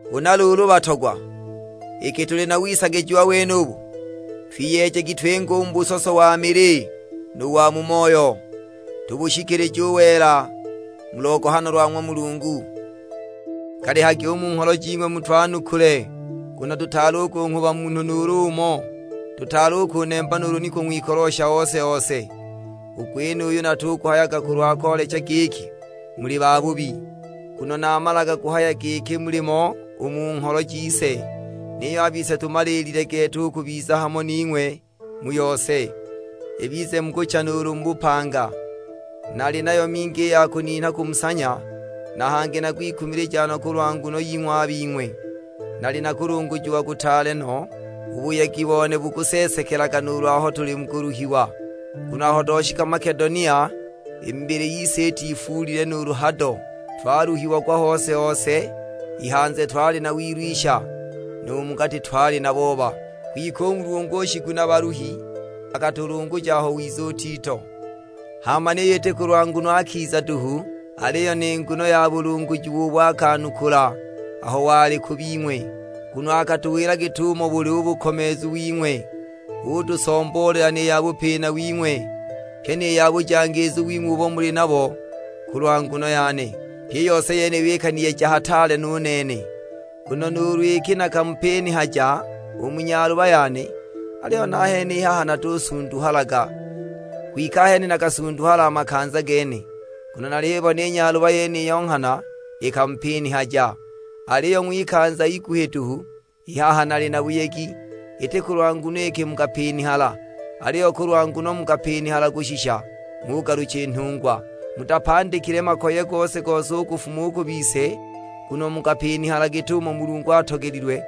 Huna luulu batogwa, iki tuli na wisagijiwa wenubu, twiyeejagi twinge u mu busoso wa mili nu wa mu moyo; tubushikilije u wela mu logohano lwa ng'wa Mulungu. Galihagi u mu ngholo jing'we mutwanukule, nguno tutaali kunghuba munhu nuulu umo, tutaali kunemba nuulu ni kung'wikolosha ose-ose! U gwenuyu natuguhayaga kulwa koolecha giki muli babubi, nguno namalaga kuhaya giki mulimo u mu ngholo jise. Niyo a bise tumaliilile gete u kubiza hamo ning'we mu yose; ibize mu kucha nuulu mu bupanga. Nali nayo mingi i ya kuninha kumusanya, na hangi nakwikumilijaga no kulwa nguno ying'we a bing'we. Nali na kulungujiwa kutaale no, u buyegi bone bukuseesekelaga nuulu aho tuli mu kuluhiwa. Nguno nghana aho twashika Makedonia i mibili yise itifuulile nuulu hado, twaluhiagwa hose-hose; i hanze twali na wilwisha, nu mu gati twali na booba. Kwike u Mulungu u Shiguna-baluhi, akatulunguja aho wiza u Tito. Hama niyo iti kulwa nguno akiza duhu, aliyo ni nguno ya bulungujiwa ubo akanukula aho wali ku bing'we; nguno akatuwila git'umo buli u bukomeezu wing'we. Utusomboolela ni ya bupina wing'we, pyi ni ya bujangiizu wing'we ubo muli nabo kulwa nguno yane. Pyi i yose yeniyo ikaniyeja hataale no u nene. Nguno nuulu iki nakamupinihaja u mu nyaluba yane, aliyo nahene i haha natusunduhalaga, (kwike i chene nakasunduhala a makanza gene) nguno nalibona i nyaluba yeniyo nghana ikamupinihaja, aliyo ng'wikanza iguhi duhu. I haha nali na buyegi, iti kulwa nguno iki mukapinihala, aliyo kulwa nguno mukapinihala kushisha ng'ugalucha i nhungwa. Mutapandikile makoye gose-gose u kufuma u ku bise, nguno mukapinihala git'umo Mulungu atogelilwe.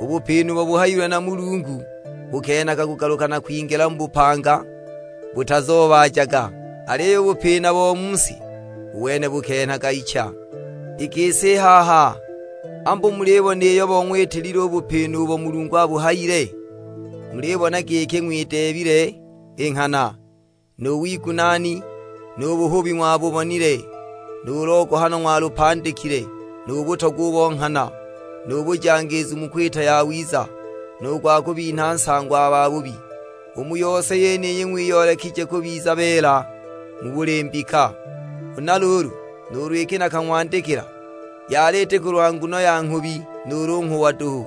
U bupina ubo buhayiwe na Mulungu bukenhaga kugaluka na kwingila mu bupanga, butazoobaajaga; aliyo u bupina bo mu si, u wene bukenhaga icha. I gisi i haha ambu mulibona iyo bong'witilile u bupina ubo Mulungu abuhayile? Mulibona giki ng'wideebile i nghana, nu wigunaani, nu buhubi ng'wabubonile, nu logohano ng'walupandikile, nu butogwa u bo nghana, nu bujangiizu mu kwita yawiza, nu gwa kubinha nsango a bahubi! U mu yose yeniyi ng'wiyoolekije kubiza beela mu buli mbika. Huna luulu nuulu iki nakang'wandikila, yali iti kulwa nguno ya nghubi nuulu u nghuwa duhu.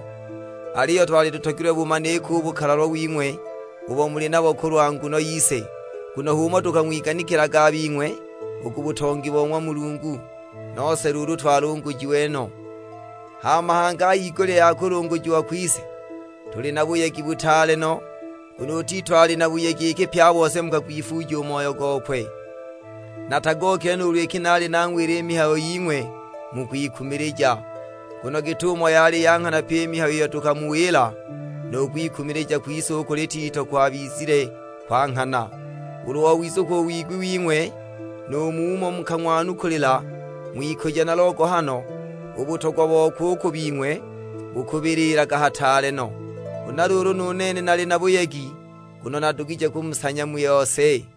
Aliyo twali tutogilwe bumanike u bukalalwa wing'we ubo muli nabo kulwa nguno yise; nguno h'umo tukang'wiganikilaga a bing'we u ku butongi bo ng'wa Mulungu. Nose luulu twalungujiwe no. Hama hangi a higulya ya kulungujiwa kwise, tuli na buyegi butaale no, nguno u Tito ali na buyegi iki pye a bose mukagwifuuja u moyo gokwe. Natagookile nuulu iki naali nang'wila i mihayo ying'we mu kwikumilija; nguno git'umo yali ya nghana pyi i mihayo iyo tukamuwila, nu kwikumilija kwise u kuli Tito kwabizile kwa nghana. Ulu owizukwa u wigwi wing'we nu mumo mukang'wanukulila, ng'wikujo na logohano, u butogwa bokwe u ku bing'we bukubililaga hataale no. Huna luulu nu nene nali na buyegi, nguno nadugije kumusanya mu yose.